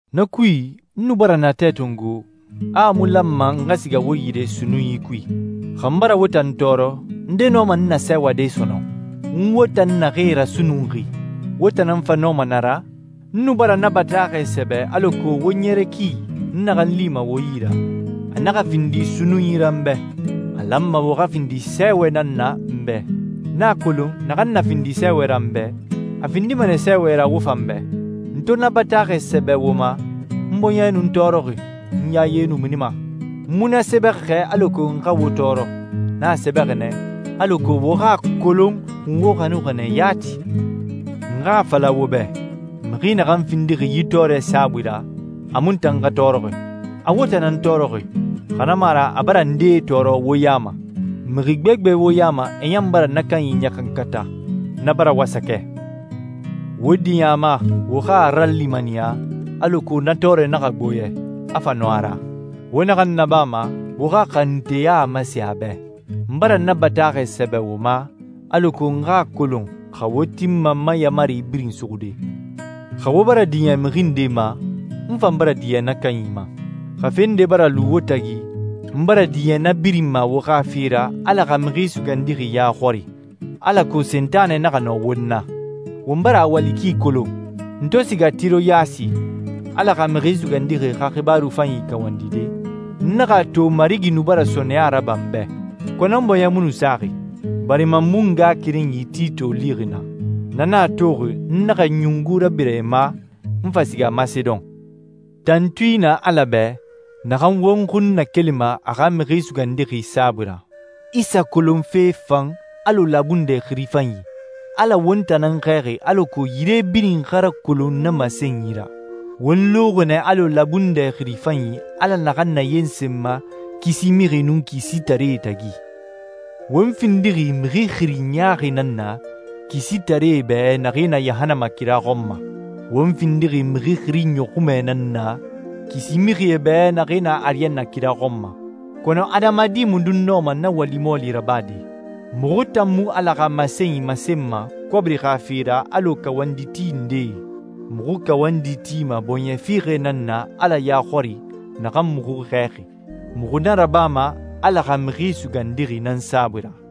Na kui, n nu bara natɛ tongo a mu lanma n xa siga wo yire sunnunyi kui. Xa n bara wo tan tɔɔrɔ, nde nɔma n nasɛɛwade sɔnɔn? N wo tan naxee rasunnunxi, wo tan nan fa nɔma na ra? N nu bara na bataaxɛ sɛbɛ alako wo ɲɛrɛ ki, n naxan lima wo yi ra, a naxa findi sunnunyi ra n bɛ. A lanma wo xa findi sɛɛwɛ nan na n bɛ. N a kolon naxan na findi sɛɛwɛ ra n bɛ, a findima nɛ sɛɛwɛ ra wo fan bɛ. N to na bataaxɛ sɛbɛ wo ma, n bɔɲɛ nu n tɔɔrɔxi, n yaye nu minima. N mu na sɛbɛxi xɛ alako n xa wo tɔɔrɔ. N a sɛbɛxi nɛ alako wo xa a kolon n wo xanuxi nɛ yati. N xa a fala wo bɛ, mixi naxan findixi yi tɔɔrɛ saabui ra, a mu n tan xa tɔɔrɔxi. A wo tan nan tɔɔrɔxi, xa na mu a ra a bara ndee tɔɔrɔ wo ya ma. Mixi gbegbe wo ya ma e ɲan bara na kanyi ɲaxankata. Na bara wasakɛ. Wo diɲɛ a ma, wo xa a ralimaniya, alako na tɔɔrɛ naxa gbo yɛ, a fa nɔ a ra. Wo naxan nabama, wo xa xanunteya masen a bɛ. N bara na bataaxɛ sɛbɛ wo ma, alako n xa a kolon xa wo tinma n ma yaamari birin suxude. Xa wo bara diɲɛ mixi nde ma, n fan bara diɲɛ na kanyi ma. Xa fe nde bara lu wo tagi, n bara diɲɛ na birin ma wo xa fe ra Ala xa Mixi Sugandixi ya xɔri alako Sentanɛ naxa nɔ won na. Won bara a wali ki kolon. N to siga Tiroyasi Ala xa Mixi Sugandixi xa xibaaru fanyi kawandide, n naxa a to Marigi nu bara sɔɔnɛya raba n bɛ. Kɔnɔ n bɔɲɛ mu nu saxi, barima n mu n ngaxakerenyi Tito lixi naa. Na nan a toxi n naxa ɲungu rabira e ma, n fa siga Masedon. Tantui na Ala bɛ, naxan won xun nakelima a xa Mixi Sugandixi saabui ra. Isa kolonfe fan alɔ labundɛ xiri fanyi. Ala won tan nan xɛɛxi alako yire birin xa rakolon na masenyi ra. Won luxi nɛ alɔ labundɛ xiri fanyi Ala naxan nayensenma kisi mixie nun kisitaree tagi. Won findixi mixi xiri ɲaaxi nan na kisitaree bɛ naxee na yahannama kira xɔn ma. Won findixi mixi xiri ɲɔxunmɛ nan na kisi mixie bɛ naxee na ariyanna kira xɔn ma. Kɔnɔ adamadi mundun nɔma na wali mɔɔli rabade? Muxu tan mu Ala xa masenyi masenma kɔbiri xa fe ra alɔ kawanditi ndee. Muxu kawandi tima bɔɲɛ fiixɛ nan na Ala ya xɔri naxan muxu xɛɛxi. Muxu na rabama Ala xa Mixi Sugandixi nan saabui ra.